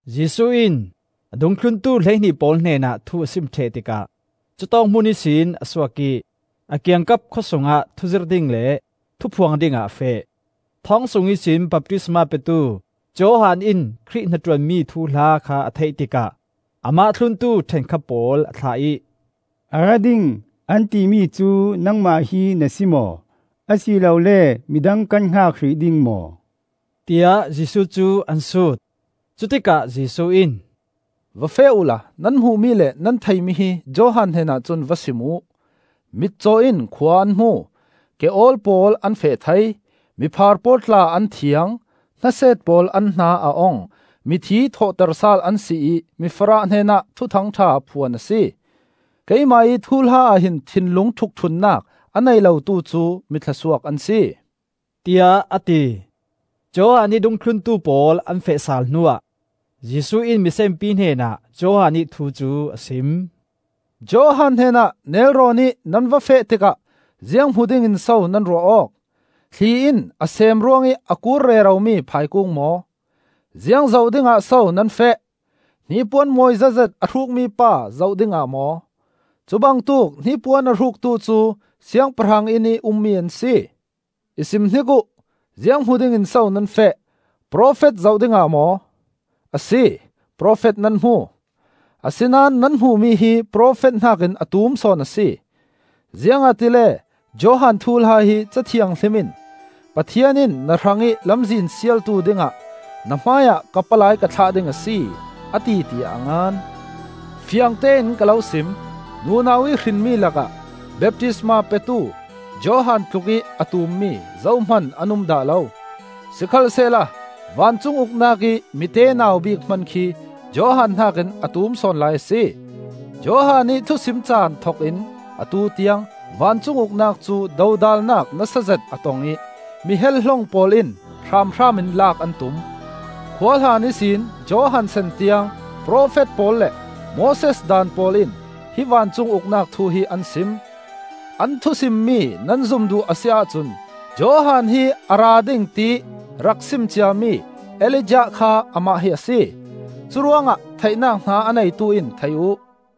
Jesuh in a dungthluntu hleihnih pawl hnenah thu a sim ṭheh tikah cutawk hmun ihsin a suak ih a kiangkap khawsungah thuzirh ding le thuphuang dingah a feh. Thawng sung ihsin baptisma petu Johan in Khrih hnaṭuanmi thuhla kha a theih tikah amah thluntu ṭhenkhat pawl a thlah ih, “A ra ding, an timi cu nangmah hi na si maw, a si lole midang kan hngak hrih ding maw?” tiah Jesuh cu an sut. Cutikah Jesuh in, “Va feh uhla nan hmuhmi le nan theihmi hi Johan hnenah cun va sim uh: mitcaw in khua an hmu, ke-awl pawl an feh thei, miphaar pawl tla an thiang, hnaset pawl an hna a ong, mithi thawhter sal an si ih mifarah hnenah Thuthang ṭha phuan a si. Keimah ih thuhla ah hin thinlung ṭhukṭhunnak a nei lotu cu mi thluasuak an si,” tiah a ti. Johan ih dungthluntu pawl an feh sal hnuah Jesuh in misenpi hnenah Johan ih thu cu a sim. “Johan hnenah nelrawnih nan va feh tikah ziang hmu dingin so nan ruah awk? Thli in a sem ruangih a kur reromi phaikung maw? Ziang zoh dingah so nan feh? Hnipuan mawi zetzet a hrukmi pa zoh dingah maw? Cubangtuk hnipuan a hruktu cu siangpahrang innih ummi an si. I sim hnik uh, ziang hmu dingin so nan feh? Profet zoh dingah maw? Asi, profet nan hmu. Asinain nan hmuhmi hi profet hnakin a tum sawn a si. Ziangahtile Johan thuhla hi Ca Thianghlim in, ‘Pathian in na hrangih lamzin sialtu dingah na hmaiah ka palai ka thlah ding a si, a ti,’ tiah a ngan. Fiangtein ka lo sim. Nunau ih hrinmi lakah baptisma petu Johan tlukih a tummi zohman an um dah lo. Sikhalsehla vancung Uknak ih mitenau bik hman khi Johan hnakin a tum sawn lai a si. Johan ih thusim caan thokin atu tiang vancung Uknak cu dodalnak nasa zet a tong ih mi hel-hlong pawl in hramhram in laak an tum. Khuahlan ihsin Johan san tiang profet pawl le Moses Daan pawl in hi vancung Uknak thu hi an sim. An thu simmi nan zum duh a si ahcun Johan hi a ra ding tiih rak sim ciami Elijah kha amah hi a si. Curuangah theihnak hna a neitu in thei uh.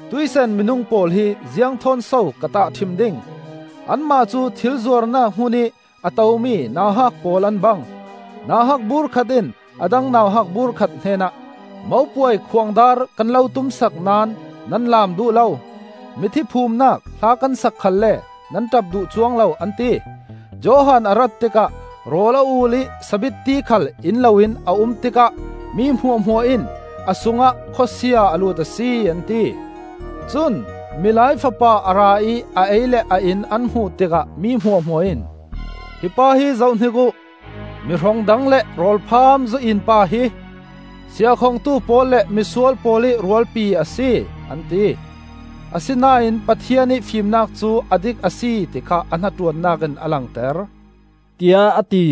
“Tuih san minung pawl hi ziang thawn so ka tahṭhim ding? Anmah cu thil zuarnak hmunih a tomi nauhak pawl an bang. Nauhak bur khat in a dang nauhak bur khat hnenah, ‘Mopuai khuangdar kan lo tumsak naón nan laam duh lo! Mithi phumnak hla kan sak khalle nan ṭap duh cuang lo,’ an ti. Johan a rat tikah rawl a ul ih sabitti khal in loin a um tikah mi hmuahhmuah in ‘A sungah khawsia a lut a si,’ an ti. Cun Milai Fapa a ra ih a ei le a in an hmuh tikah mi hmuahhmuah in, ‘Hi pa hi zohhnik uh! Mi hrong dang le rawlpham zu-in pa hi; siahkhongtu pawl le misual pawl ih rualpi a si,’ an ti. Asinain Pathian ih fimnak cu a dik a si ti kha a hnaṭuannak in a langter,” tiah a ti.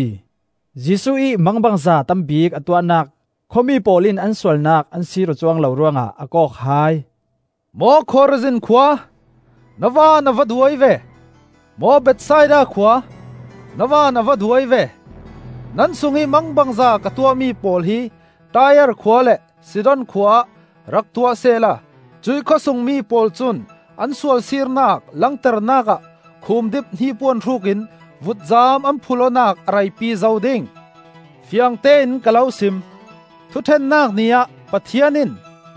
Jesuh ih mangbangza tam bik a tuahnak khuami pawl in an sualnak an sir awk cuang lo ruangah a kawk hai. “Maw Khorazin khua, na van a va duai ve! Maw Bethsaida khua, na van a va duai ve! Nan sungih mangbangza ka tuahmi pawl hi Tai-ar khua le Sidon khua ah rak tuah sisehla cuih khawsungmi pawl cun an sualsirnak langternak ah khumdip hnipuan hrukin vutcam an phulh awknak a reipi zo ding. Fiangtein ka lo sim: Thuṭhennak Ni ah Pathian in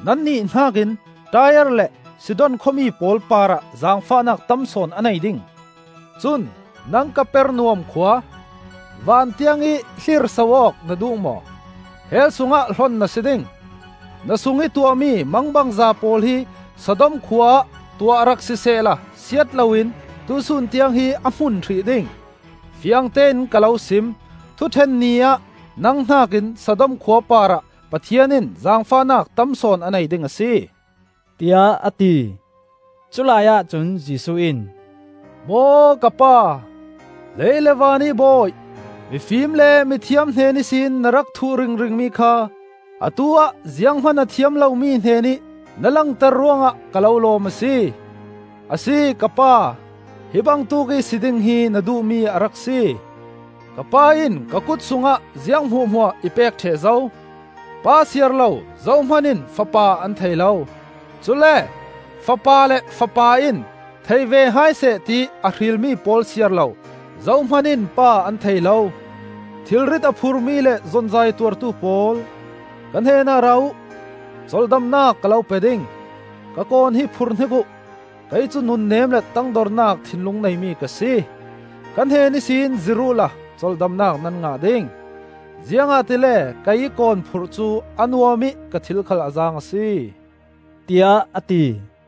nannih hnakin Tai-ar le Sidon khuami pawl parah zaangfahnak tam sawn a nei ding. Cun nang Kapernaum khua! Van tiangih hlirso awk na duh maw? Hell sungah hlon na si ding! Na sungih tuahmi mangbangza pawl hi Sodom khua ah tuah rak sisehla siat loin tuihsun tiang hi a hmun hrih ding! Fiangtein ka lo sim: Thuṭhen Ni ah nang hnakin Sodom khua parah Pathian in zaangfahnak tam sawn a nei ding a si,” tiah a ti. Culai ahcun Jesuh in, “Maw Ka pa, lei le vanih Bawi! Mifim le mithiam hnen ihsin na rak thuh ringringmi kha atu-ah zianghman a thiam lomi hnenih na langter ruangah ka lo lawm a si. Asi, Ka pa, hi bangtuk ih si ding hi na duhmi a rak si. “Ka Pa in ka kut sungah ziang hmuahhmuah i pek ṭheh zo. Pa siar lo zohman in Fapa an thei lo; cule Fapa le Fapa in thei ve hai seh tiih a hrilmi pawl siar lo, zohman in Pa an thei lo. “Thilrit a phurmi le zonzaih a tuartu pawl, ka hnenah ra uh, colhdamnak ka lo pe ding. Ka kawn hi phurhnik uh. Kei cu nunnem le tangdornak thinlung neimi ka si. Ka hnen ihsin zir uhla colhdamnak nan ngah ding. Ziangahtile keiih kawn phurh cu a nuam ih ka thil khal a zaang a si,” tiah a ti.